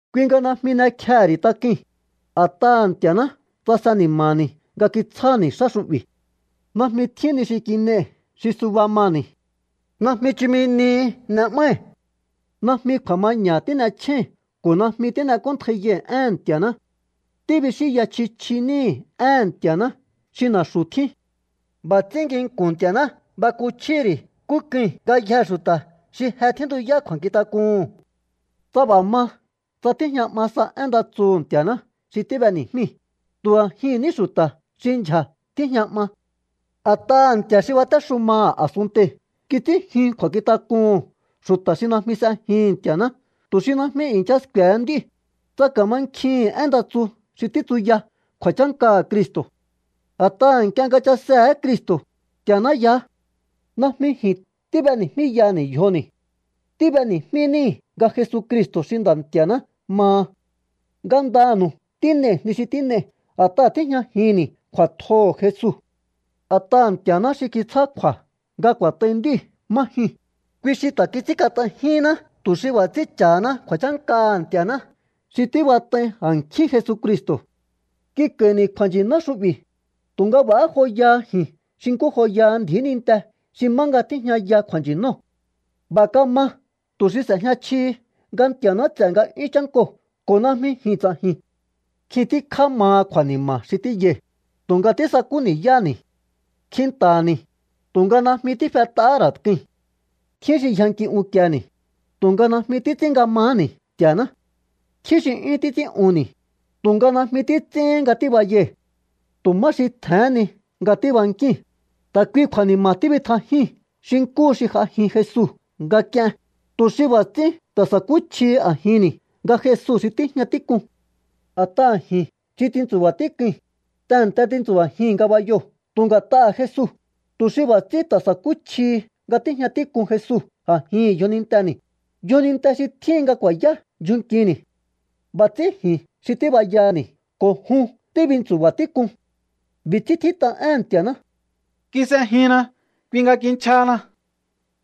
Kui nga najmi n'ekjehe̱ ri̱ tak'ui̱n, a̱t'aha̱ Nti̱a̱ná tsase ni̱ma̱ni̱ nga kitsjáni̱ xá xu'bi̱. Najmi tjín ni xi kin'ei̱ xi suba mani̱. Najmi chumi nihi n'e'mái̱. Najmi kju̱a̱maña̱ tín'echjéi̱n ko̱ najmi tín'ek'óntjaiyai̱ éhe̱n Nti̱a̱ná. Tíbixínya chji chji níi̱ éhe̱n Nti̱a̱ná xi na̱xu̱ tjín. B'a̱ ts'ín nginku̱n Nti̱a̱ná bakuchjíhi̱ ri̱ nkú k'ui̱n ngayjee̱ xu̱ta̱ xi je tjíntuyá kju̱a̱nkjintak'uhu̱n. Tsa b'a̱ ma tsa tíjña 'ma sa én nda tsuhu̱ Nti̱a̱ná xi tíb'eni̱jmíi̱, tu̱ a̱jihi̱n ní xu̱ta̱ xi ndyja̱ tíjña 'ma. A̱t'aha̱ nti̱a̱ xi batéxumaha̱ a̱sunntei̱ kits'ín jyun kju̱a̱nkjintak'uhu̱n xu̱ta̱ xi najmi s'ejihi̱n Nti̱a̱ná tu̱ xi najmi i̱ncha sku̱e̱he nd'íu̱, tsa ka̱mankjihi̱n én nda tsu xi títsuya kju̱a̱chánkaha̱ Cristo̱. A̱t'aha̱ nk'ie nga chasehe̱é Cristo̱, Nti̱a̱ná yaá. Najmi ji̱n tíb'eni̱jmíyaha̱ni̱ yjoni̱. Tíb'eni̱jmí níi̱ nga Jesucristo̱ xi Nda̱ Nti̱a̱ná maha. Ngandanu̱u tín'ei̱ ni xi tín'ei̱ a̱t'aha̱ tíjñajinni̱ kju̱a̱tjoho̱ Jesu. A̱t'aha̱ Nti̱a̱ná xi kitsjá kju̱a̱ nga ku̱a̱t'ai nd'íu̱ má jyuu̱n, kui xi ta̱ kits'ínkat'aijínná tu̱ xi b'a̱ ts'ín cha̱haná kju̱a̱chánkaha̱ Nti̱a̱ná xi tíbat'ai a̱nkjín Jesucristo̱. Kik'a̱i̱ni̱ kju̱a̱nchi̱ná xu'bi̱, tu̱nga b'a̱há joya ji̱n xi nkú joyaha ndji̱í ninte xi má nga tíjñaya kju̱a̱nchi̱nóo̱. B'a̱ kama tu̱ xi s'e̱jña chjihi nga Nti̱a̱ná ts'e̱ nga'yún chánkoo̱ ko̱ najmi ji̱n ts'a̱ji̱n. Nkjin tíkjá maha kju̱a̱ni̱ma̱ xi tíyai̱, tu̱nga tísakú ni̱yáháni̱. Kjinta̱ha̱ni̱, tu̱nga najmi tífet'ahá ra̱ k'ui̱n. Tjín xi yjanki unkieni̱, tu̱nga najmi títs'ín nga maháni̱ Nti̱a̱ná. Tjín xi 'yún títs'ín'unni̱, tu̱nga najmi títs'íhin nga tíbayai̱. Tu̱ má xi tje̱hén ni nga tíbankíi̱n, ta̱ kuihi kju̱a̱ni̱ma̱ tibitjajíi̱n xi nkúhu̱ xi j'ajin Jesu nga k'ien, tu̱ xi b'a̱ ts'ín ta̱ sa̱kúchjihi a̱jinni̱ nga Jesu xi tíjña tík'un. A̱t'aha̱ ji̱n xi tintsu̱ba̱ tík'ui̱n, tehe̱nte tintsu̱ba̱jii̱n ngabayoo̱ tu̱ nga̱t'aha̱ Jesu, tu̱ xi b'a̱ ts'ín ta̱ sa̱kúchjihi nga tíjña tík'un Jesu a̱jihi̱n yjoninteni̱, yjoninte xi tjíhin nga ku̱a̱yá ndyjun nkini̱. B'a̱ ts'ín ji̱n xi tíbayaha̱ni̱ ko̱ jun tíbintsu̱ba̱ tík'un. B'i̱ ts'ín tjít'a éhe̱n Nti̱a̱ná: “Kis'ejinna, kui nga kinchjahana.”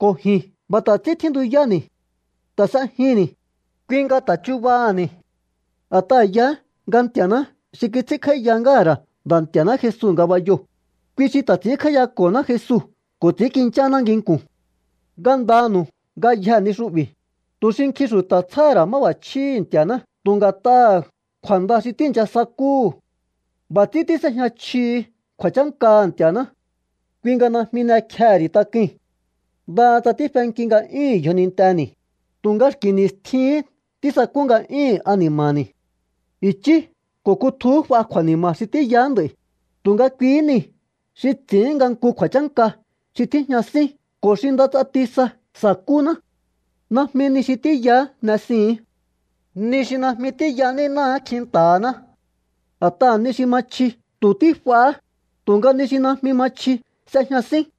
Ko̱ ji̱n b'a̱ ta̱ ts'ín tjíntuyáni̱. Ta̱ s'ejinni̱, kui nga ta̱ chubaha̱ni̱. A̱t'aha̱ yaá nga Nti̱a̱ná xi kits'ínkj'áíya ngáha̱ ra̱ Nda̱ Nti̱a̱ná Jesu ngabayoo̱, kui xi ta̱ ts'i̱ínkj'áíyako̱ná Jesu ko̱ ts'i̱ínkincháná nginku̱n. Ngandanu̱u ngayjee̱ ni xu'bi̱, tu̱ xi nkjin xu̱ta̱ tsjáha̱ ra̱ máb'a̱chjíhi̱ Nti̱a̱ná tu̱ nga̱t'aha̱ kju̱a̱nda xi tíi̱ncha sakúhu̱. B'a̱ ts'ín tís'ejña chjihi kju̱a̱chánkaha̱ Nti̱a̱ná. Kui nga najmi n'ekjehe̱ ri̱ tak'ui̱n. Ndaha tsa tífenki nga'yúhu̱n yjoninteni̱, tu̱nga xki̱ ni̱stjihín tísakú nga'yúhu̱n ani̱ma̱ni̱. I̱chí ko̱ kutjuhú f'a kju̱a̱ni̱ma̱ xi tíyaá nd'a̱i̱, tu̱nga kuihí niu̱ xi ts'i̱ín nga nku kju̱a̱chánka xi tíjña sín ko̱ xi nda ts'ati sa sa̱kúná. Najmi ni xi tíyaá n'esihi̱ín. Ni xi najmi tíya nínáá kjinta̱ha̱ná. A̱t'aha̱ ni xi ma chji tu̱ tífahá, tu̱nga ni xi najmi ma chji s'ejña sín.